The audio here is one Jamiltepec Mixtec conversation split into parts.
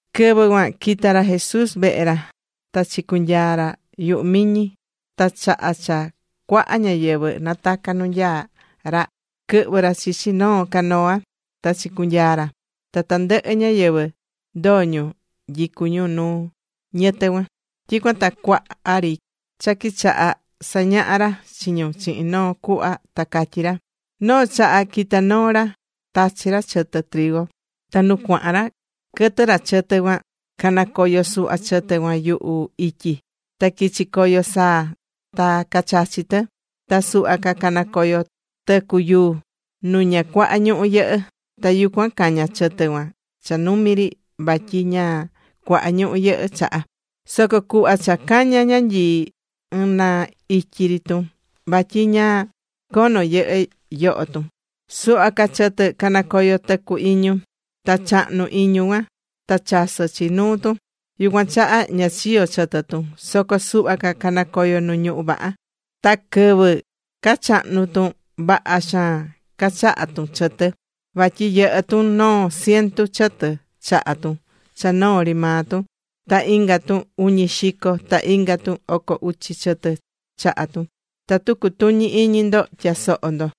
Quɨvɨ cuan quita̱ ra Jesús vehe ra ta chicunyaa̱ ra yuhu miñi. Ta chaha cha cuaha ñáyɨvɨ nataca̱ nu nyaá ra, quɨhvɨ̱ ra chichi noo canoa ta chicunyaa̱ ra. Ta tandɨhɨ ñáyɨvɨ ndoo̱ ñu nyicú ñu nu ñɨtɨ cuan. Tyicuan ta cuaha ri cha quichaha sañahá ra chi ñu chihin noo cuhva ta catyí ra: ―Noo chaha quita̱ noo ra, tachi̱ ra chɨtɨ. Ta nu cuahan ra quɨtɨ̱ ra chɨtɨ cuan, canacoyo̱ suhva chɨtɨ cuan yuhu ityi. Ta quichi̱ coyo saa ta cachachi̱ tɨ. Ta suhva ca canacoyo̱ tɨcu yuu, nu ña cuaha ñuhú yɨhɨ́. Ta yucuan caña̱ chɨtɨ cuan cha numi ri vatyi ña cuaha ñuhú yɨhɨ́ chaha. Soco cuhva cha caña̱ ñanyii ɨɨn na ityi ri tun, vatyi ña cono yɨhɨ́ yoho tun. Suhva ca chɨtɨ canacoyo̱ tɨcu iñu. Ta chahnu̱ iñu cuan. Ta chasɨ̱ chi nuu tun. Yucuan chaha ña chiyo̱ chɨtɨ tun. Soco suhva ca canacoyo̱ nu ñuhú vaha. Ta quɨvɨ cachahnu tun, vaha xaan cachaha̱ tun chɨtɨ, vatyi yɨhɨ́ tun noo cientu chɨtɨ chaha tun cha noo ri maa tun. Ta inga tun uñi xico, ta inga tun oco uchi chɨtɨ chaha̱ tun. ¡Tatu cutuñi iñi ndo, tya̱soho ndo!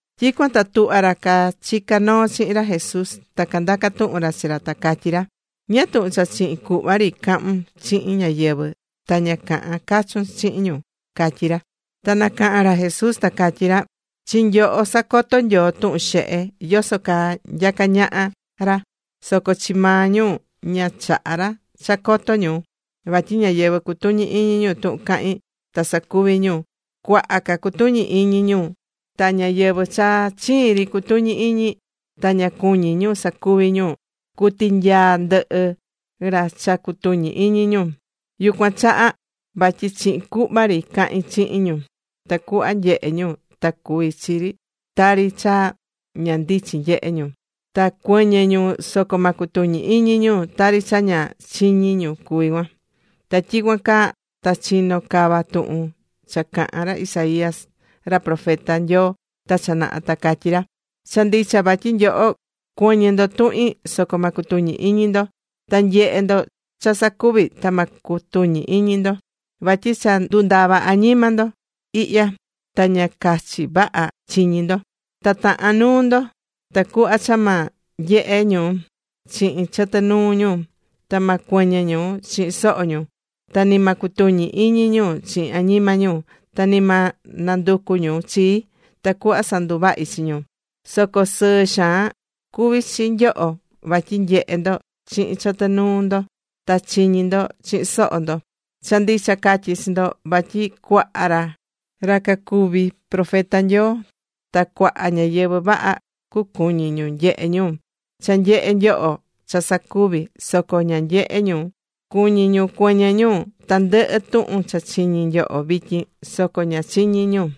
Tyicuan ta tuhva ra cachicá noo chihin ra Jesús, ta candaca̱ tuhun ra chi ra, ta catyí ra: ―¿Ñáá tuhun cha chihin cuhva ri cahún chihin ñáyɨvɨ, ta ña cahán cachun chihin ñu? ―cacatyí ra. Ta nacaha̱n ra Jesús ta catyí ra: ―Chi nyoho sacotó Nyoo tuhun xehe, yoso caa nyacá ñaha ra, soco chi maa ñu ña chahá ra cha coto ñu. Vatyi ñáyɨvɨ cutuñí iñi tuhun cahín ta sacuví ñu, cuaha ca cucutuñi iñi ñu. Ta ñáyɨvɨ cha chiin ri cutuñí iñi, ta ña cuñí ñu sacuvi ñu, cutinyaa ndɨhi cha cutuñí iñi ñu. Yucuan chaha vatyi chihin cuhva ri cahín chihin ñu, tacuhva nyehe ñu ta cuví chi tari cha ña ndichin nyehe ñu. Ta cuɨñɨ ñu soco ma cutuñi iñi ñu, tari cha ña chiñi ñu cuví cuan. Ta tyicuan caa ta chinó cava tuhun cha caha̱n ra Isaías ra profeta Nyoo ta cha naha, ta catyí ra: Cha ndicha vatyi nyoho cuɨñɨ ndo tuhin, soco ma cutuñi iñi ndo. Ta cunyehe ndo cha sacuví, ta ma cutuñi iñi ndo. Vatyi cha ndundava̱ añima ñáyɨvɨ ihya, ta ña cachi vaha chiñí ñu. Ta tahán nuu ñu, Tacuhva cha ma nyehe ñu chihin chɨtɨ nuu ñu. Ta ma cuɨñɨ ñu chihin soho ñu. Ta ni ma cutuñi iñi ñu chihin añima ñu. Ta ni ma nanducu ñu chii, tacuhva sanduvahi chi ñu. ’Soco sɨɨ xaan cuví chi nyoho, vatyi nyehé ndo chihin chɨtɨ nuu ndo, ta chiñí ndo chihin soho ndo. Cha ndicha catyí chi ndo, vatyi cuaha ra cacuvi̱ profeta Nyoo ta cuaha ñáyɨvɨ vaha, cacuñi̱ ñu nyehe ñu cha nyehé nyoho cha sacuví, soco ña nyehe̱ ñu. Cuñi̱ ñu cuɨñɨ ñu tandɨhɨ tuhun cha chiñi nyoho vityin, soco ña chiñi̱ ñu.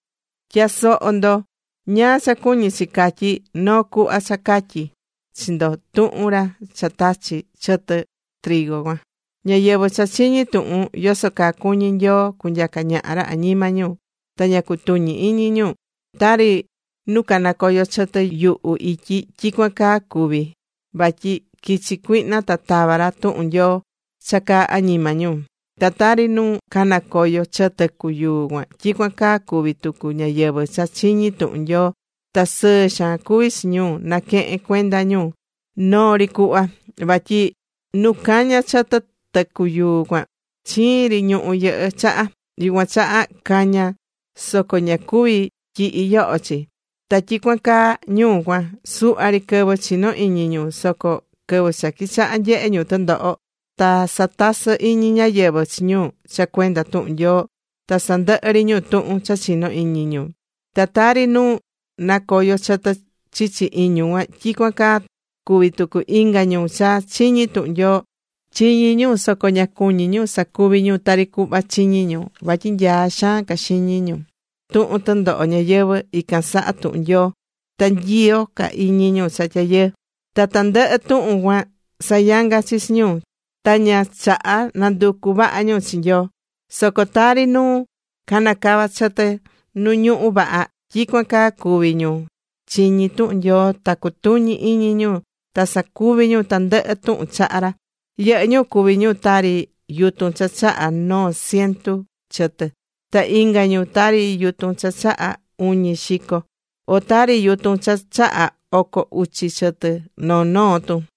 ’Tya̱soho ndo ñáá cha cuñí chi catyi noo cuhva cha catyi̱ chi ndo tuhun ra cha tachí chɨtɨ cuan: Ñáyɨvɨ cha chiñí tuhun yoso caa cuñí Nyoo cunyaca ñaha ra añima ñu, ta ña cutuñí iñi ñu, tari nu canacoyo chɨtɨ yuhu ityi, tyicuan caa cuví ñu. Vatyi quichi̱ cuihna ta tava̱ ra tuhun Nyoo cha caa añima ñu. Ta tari nu canacoyo̱ chɨtɨ tɨcu yuu cuan, tyicuan caa cuví tucu ñáyɨvɨ cha chiñí tuhun Nyoo, ta sɨɨ xaan cuví chi ñu naquehen cuenda ñu noo ri cuhva. Vatyi nu caña̱ chɨtɨ tɨcu yuu cuan, chiin ri ñuhú yɨhɨ́ chaha. Yucuan chaha caña̱ soco ña cuví tyihi yoho chi. Ta tyicuan caa ñu cuan. Suhva ri quɨvɨ chinó iñi ñu. Soco quɨvɨ cha quichaha nyehe ñu tɨndoho, ta satasɨ iñi ñáyɨvɨ chi ñu cha cuenda tuhun Nyoo ta sandɨhɨ ri ñu tuhun cha chinó iñi ñu. Ta tari nu canacoyo chɨtɨ chichi iñu cuan, tyicuan caa cuví tucu inga ñu cha chiñí tuhun Nyoo. Chiñí ñu, soco ña cuñí ñu sacuvi ñu tari cuhva chiñí ñu. Vatyi nyaá xaan ca xiñi ñu tuhun tɨndoho ñayɨvɨ̱ ican saha tuhun Nyoo. Ta nyiyo ca iñi ñu cha tyayɨɨ. Ta tandɨhɨ tuhun cuan sayanga chi chi ñu, ta ña chahá nanducu vaha ñu chi Nyoo. Soco tari nu canacava̱ chɨtɨ nu ñuhu vaha, tyicuan caa cuví ñu chiñí tuhun Nyoo, ta cutuñí iñi ñu, ta sacuví ñu tandɨhɨ tuhun cahán ra. Yɨhɨ́ ñu cuví ñu tari yutun cha chaha noo cientu chɨtɨ, ta inga ñu tari yutun cha chaha uñi xico, o tari yutun cha chahá oco uchi chɨtɨ noo noo tun.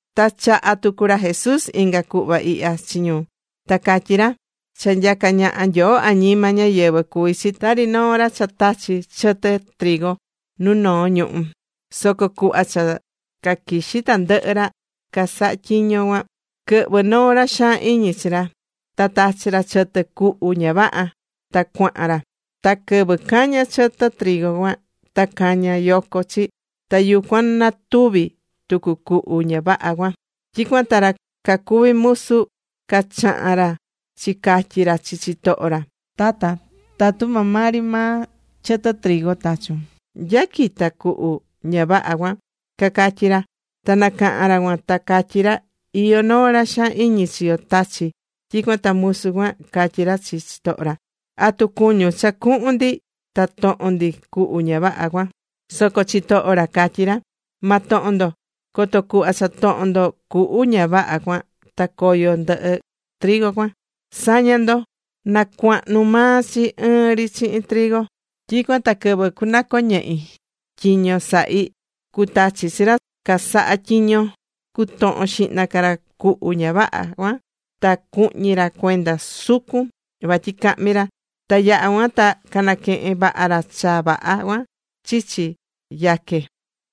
Ta chaha̱ tucu ra Jesús inga cuhva ihya chi ñu; ta catyí ra: ―Cha nyacá ñaha Nyoo añima ñáyɨvɨ cuví chi tari noo ra cha tachi̱ chɨtɨ nu noo ñuhú. Soco cuhva cha caquixí tandɨhɨ ra casahá tyiño cuan, quɨhvɨ̱ noo ra xaan iñi chi ra, ta tachi̱ ra chɨtɨ cuhu ña vaha, ta cuahan ra. Ta quɨvɨ caña̱ chɨtɨ cuan, ta caña̱ yoco chi, ta yucuan na tuvi tucu cuhu ña vaha cuan. Tyicuan ta ra cacuví musu, cachaha̱n ra chicatyi̱ ra chi chitoho ra: “Tata, tatu maa maa ri maa chɨtɨ tachu̱n, ¿nya quita̱ cuhu ña vaha cuan?” cacatyí ra. Ta nacaha̱n ra cuan ta catyi ra: “Iyó noo ra xaan iñi chi yo tachi̱.” Tyicuan ta musu cuan, catyí ra chi chitoho ra: “¿Atu cuñún cha cuhun ndi ta tohon ndi cuhu ña vaha cuan?” Soco chitoho ra catyí ra: “Ma tohon ndo, coto cuhva cha tohon ndo cuhu ña vaha cuan, ta coyo ndɨhɨ cuan. Sa̱ña ndo, na cuahnu maa chi ɨɨn ri chihin trigo cuan, tyicuan ta quɨvɨ cunɨcoñehi tyiño sahí, cutachi chi ra casaha tyiño cutohon xihna ca ra cuhu ña vaha cuan ta cuhñi ra cuenda sucun, vatyi cahmi ra. Ta yaha cuan ta canaquehen vaha ra cha vaha cuan chichi yaque.”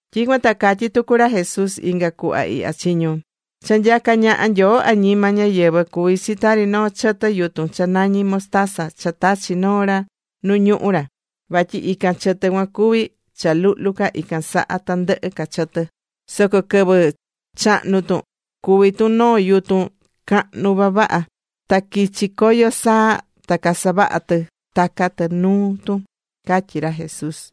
Tyicuan ta catyí tucu ra Jesús inga cuhva ihya chi ñu: ―Cha nyacá ñaha Nyoo añima ñáyɨvɨ cuví chi tari noo chɨtɨ yutun cha nañí mostaza cha tachi̱ noo ra nu ñuhú ra. Vatyi ican chɨtɨ cuan cuví cha luhlu ca ican saha tandɨhɨ ca chɨtɨ. Soco quɨvɨ chahnu̱ tun cuví tun noo yutun cahnu vavaha. Ta quichi̱ coyo saa, ta casavahá tɨ taca tɨ nuu tun ―catyí ra Jesús.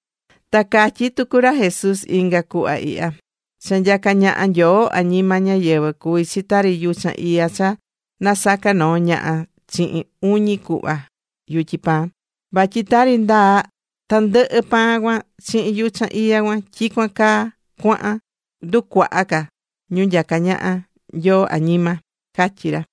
Ta catyí tucu ra Jesús inga cuhva ihya: ―Cha nyacá ñaha Nyoo añima ñáyɨvɨ cuví chi tari yuchan iya cha nasaca̱ noo ñaha chihin uñi cuhva yutyi pan. Vatyi tari ndaa tandɨhɨ pan cuan chihin yuchan iya cuan, tyicuan caa cuahan nducuaha ca ñu nyacá ñaha Nyoo añima ―catyí ra.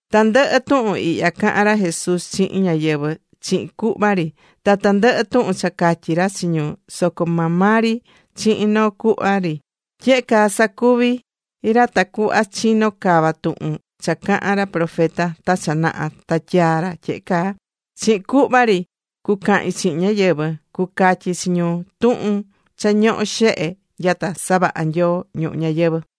Tandɨhɨ tuhun ihya cahan ra Jesús chihin ñáyɨvɨ chihin cuhva ri. Ta tandɨhɨ tuhun cha catyi̱ ra chi ñu soco maa maa ri chihin noo cuhva ri. Tyehe caa sacuvi̱ ra tacuhva chino cava tuhun cha cahán ra profeta ta cha naha ta tyaa̱ ra tyehe caa: Chihin cuhva ri cucahin chihin ñáyɨvɨ. Cucatyi chi ñu tuhun cha ñohó xehe nyata savaha̱ Nyoo ñuhu ñayɨvɨ̱.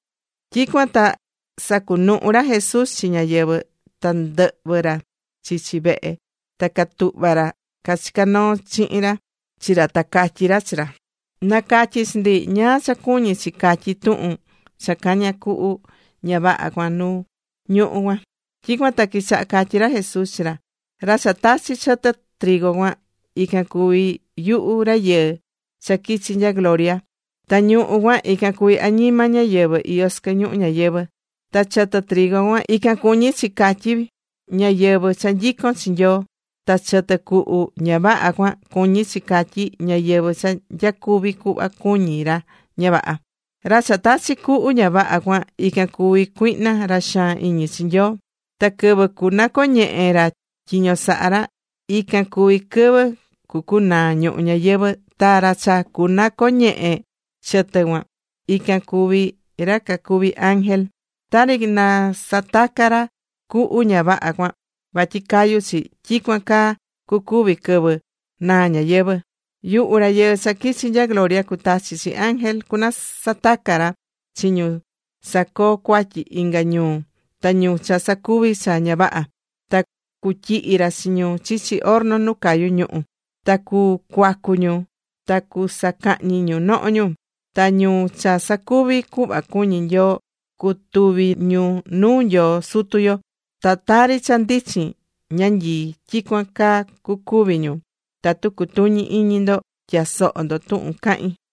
Tyicuan ta sacunuhu̱ ra Jesús chi ñáyɨvɨ, ta ndɨhvɨ̱ ra chichi vehe. Ta catuhva̱ ra cachicá noo chihin ra chi ra, ta catyí ra chi ra: ―Na̱catyi chi ndi ñáá cha cuñí chi catyí tuhun cha caña̱ cuhu ña vaha cuan nu ñuhu cuan. Tyicuan ta quichaha catyí ra Jesús chi ra: ―Ra cha tachi̱ chɨtɨ cuan ican cuví yuhu Rayɨɨ cha quichi̱ nya gloria. Ta ñuhú cuan, ican cuví añima ñáyɨvɨ iyó sɨquɨ ñuhu ñayɨvɨ̱. Ta chɨtɨ cuan ican cuñí chi catyí ñáyɨvɨ cha nyicón chi Nyoo, ta chɨtɨ cuhu ña vaha cuan cuñí chi catyí ñáyɨvɨ cha nyacuví cuhva cuñí ra ña vaha. ’Ra cha tachi̱ cuhu ña vaha cuan, ican cuví cuihna ra xaan iñi chi Nyoo. Ta quɨvɨ cunacoñehe ra tyiño saha ra, ican cuví quɨvɨ cucunaa ñuhu ñayɨvɨ̱. Ta ra cha cunacoñehe chɨtɨ cuan, ican cuví ra cacuví ángel. Tari nasataca̱ ra cuhu ña vaha cuan vatyi cayu chi, tyicuan caa cucuvi quɨvɨ naa ñayɨvɨ̱. Yuhu Rayɨɨ cha quichi nya gloria cutachi chi ángel cunasataca ra chi ñu sacoo cuatyi inga ñu, ta ñu cha sacuví cha ña vaha. Ta cutyihi ra chi ñu chichi horno nu cayú ñuhu. Ta cucuacu ñu ta cusacahñi ñu noho ñu. Ta ñu cha sacuví cuhva cuñí Nyoo cutuvi ñu nuu Nyoo Sutu yo. Ta tari cha ndichin ñanyii, tyicuan caa cucuvi ñu. Tatu cutuñí iñi ndo, tya̱soho ndo tuhun cahín.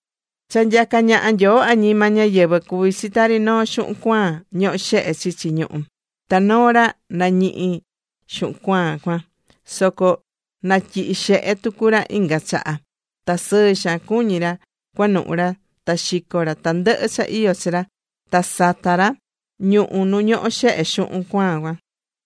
’Cha nyacá ñaha Nyoo añima ñáyɨvɨ cuví chi tari noo xuhun cuaan ñohó xehe chichi ñuhú. Ta noo ra nañihi̱ xuhun cuaan cuan, soco natyihi̱ xehe tucu ra inga chaha ta sɨɨ xaan cuñí ra cuanuhu ra ta xico̱ ra tandɨhɨ cha iyó chi ra, ta sata̱ ra ñuhu nu ñohó xehe xuhun cuaan cuan.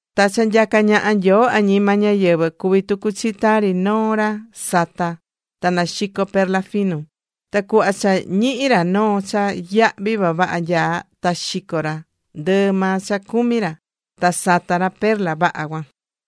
’Ta cha nyacá ñaha Nyoo añima ñáyɨvɨ, cuví tucu chi tari noo ra satá ta naxicó perla finu. Ta cuhva cha ñihi̱ ra noo cha yahví vavaha nyaá, ta xico̱ ra ndɨɨ maa cha cumi̱ ra, ta sata̱ ra perla vaha cuan.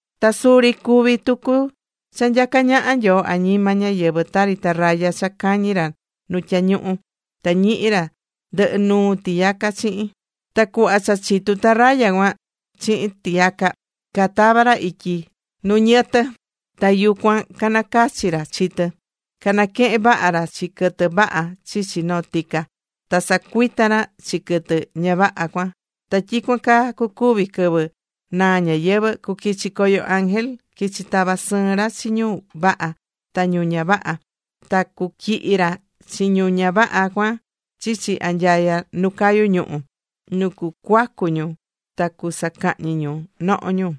’Ta suri cuví tucu cha nyacá ñaha Nyoo añima ñáyɨvɨ tari tarraya cha cañí ra nu tyañuhu, ta ñihi ra ndɨhɨ nuu tiyaca chihin. Ta cuhva cha chitu̱ tarraya cuan chihin tiyaca, catava̱ ra ityi nu ñɨtɨ, ta yucuan canacachi̱ ra chi tɨ, canaquehe̱n vaha ra chi quɨtɨ vaha chichi noo tica, ta sacuita̱ ra chi quɨtɨ ña vaha cuan. Ta tyicuan caa cucuvi quɨvɨ naa ñayɨvɨ̱, cuquichi coyo ángel, quichi tava sɨɨn ra chi ñu vaha ta ñu ña vaha. Ta cutyihi ra chi ñu ña vaha cuan chichi anyaya nu cayú ñuhu̱, nu cucuacu ñu ta cusacahñi ñu noho ñu.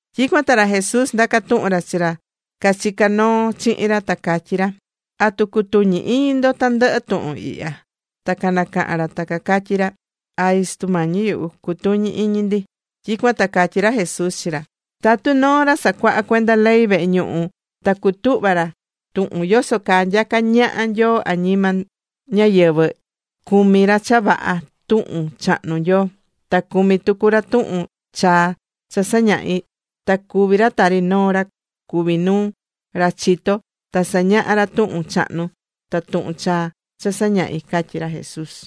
Tyicuan ta ra Jesús ndaca̱ tuhun ra chi ra cachicá noo chihin ra, ta catyí ra: ―¿Atu cutuñí iñi ndo tandɨhɨ tuhun ihya? Ta nacaha̱n ra ta cacatyí ra: ―Ay, Sutu Mañi yuhu. Cutuñí iñi ndi. Tyicuan ta catyí ra Jesús chi ra: ―Tatu noo ra sacuahá cuenda ley vehe ñuhu, ta cutuhva ra tuhun yoso caa nyacá naha Nyoo añima ñáyɨvɨ, cumí ra cha vaha tuhun chahnu Nyoo, ta cumí tucu ra tuhun chaa cha sañahí. Ta cuví ra tari noo ra cuví nuu, ra chitó ta sañahá ra tuhun chahnu ta tuhun chaa cha sañahí ―catyí ra Jesús.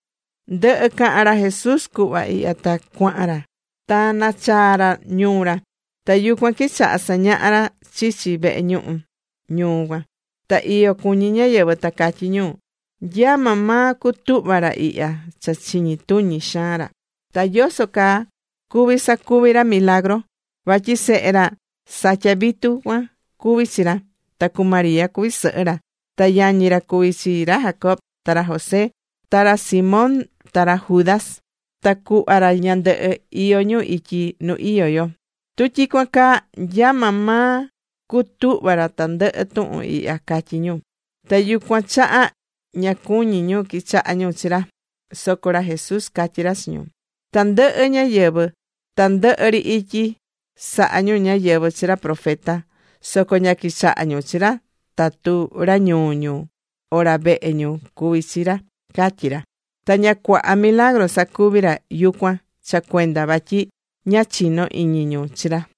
Ndɨhɨ̱ cahan ra Jesús cuhva ihya ta cuahan ra. Ta nachaa̱ ra ñuu ra. Ta yucuan quichaha sañaha ra chichi vehe ñuhu ñuu cuan. Ta iyo cuñí ñáyɨvɨ ta catyí ñu: ―¿Nya maa maa cutuhva̱ ra ihya cha chiñi tuñi xaan ra? ¿Ta yoso caa cuví sacuvi ra milagru? Vatyi sehe ra satyá vitu cuan cuví chi ra. Ta cu María cuví sɨhɨ ra. Ta yañi ra cuví chi ra Jacobo, ta ra José, ta ra Simón ta ra Judas. Ta cuhva ra ñandɨhɨ, iyó ñu ityi nu iyó yo. Tu tyicuan caa, ¿nya maa maa cutuhva̱ ra tandɨhɨ tuhun ihya? ―catyí ñu. Ta yucuan chaha ña cuñí ñu quichaha ñu chi ra. Soco ra Jesús catyí ra chi ñu: ―Tandɨhɨ ñáyɨvɨ tandɨhɨ ri ityi sahá ñu ñáyɨvɨ chi ra profeta. Soco ña quichahá ñu chi ra tatu ra ñuu ñu, o ra vehe ñu cuví chi ra ―catyí ra. Ta ña cuaha milagru sacuvi̱ ra yucuan cha cuenda vatyi ña chinó iñi ñu chi ra.